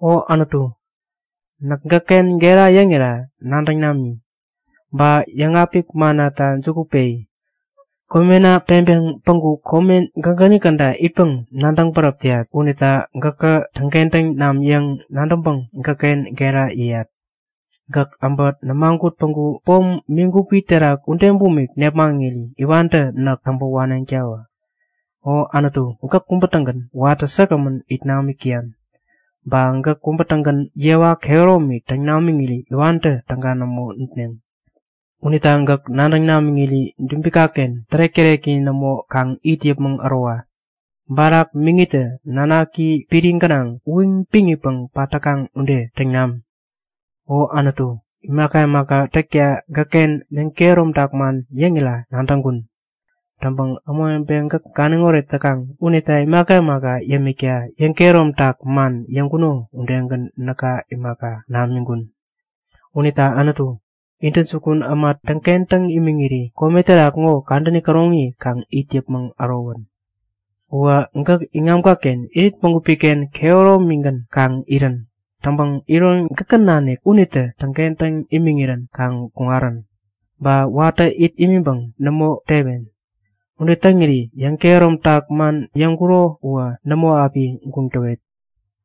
O Anutu, näk gäkken gera yäŋira nadäŋ nami! Ba yäŋapik mannata juku peyi. Komena peŋpeŋ päŋku kome gägäni käda itpäŋ nadäŋ bäräp täyat. Unita gäkä täŋkentäŋ nam yäŋ nadäŋpäŋ gäkken gera yäyat. Gäkä äbä nämagut päŋku pom migupi terak ude bumik nepmaŋiri iwantä näk täŋpä waneŋtawä. O Anutu gäk kubä-tägän watä säkgämän it namik täyan. Ba gäk kubä-tägän yewa kehäromi täŋ namiŋiri iwantä täga nämo nutneŋ. Unita gäk nadäŋ namiŋiri dubikaken tärek-täreki nämo kaŋ it yäpmäŋ ärowa. Barak miŋitä nanaki piri gänaŋ uyiŋ-piŋitpäŋ pat täkaŋ ude täŋ nam. O Anutu, imaka imaka täkta gäkken yäŋkehäromtak man yäŋira nadäŋkun. Täŋpäŋ ämawebe gäk ganiŋoret täkaŋ unita imaka imaka yämikta yäŋkehäromtak man yäŋkuno udegän näka imaka, namiŋkun. Unita Anutu, intäjukun äma täŋkentäŋ imiŋiri kome terak ŋo kadäni käroŋi kaŋ it yäpmäŋ ärowän. Uwä gäk iŋamkaken irit bägupiken kehäromigän kaŋ irän. Täŋpäŋ iron gäkä nanik unitä täŋkentäŋ imiŋirän kaŋ kuŋarän. Ba watä it imiŋpäŋ nämo tewen. Ude täŋiri yäŋkehäromtak man yäŋkuro uwä nämo api guŋ täwet.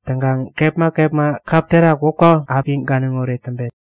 Täŋkaŋ kepma kepma kap terak wäpka api ganiŋoret täŋpet.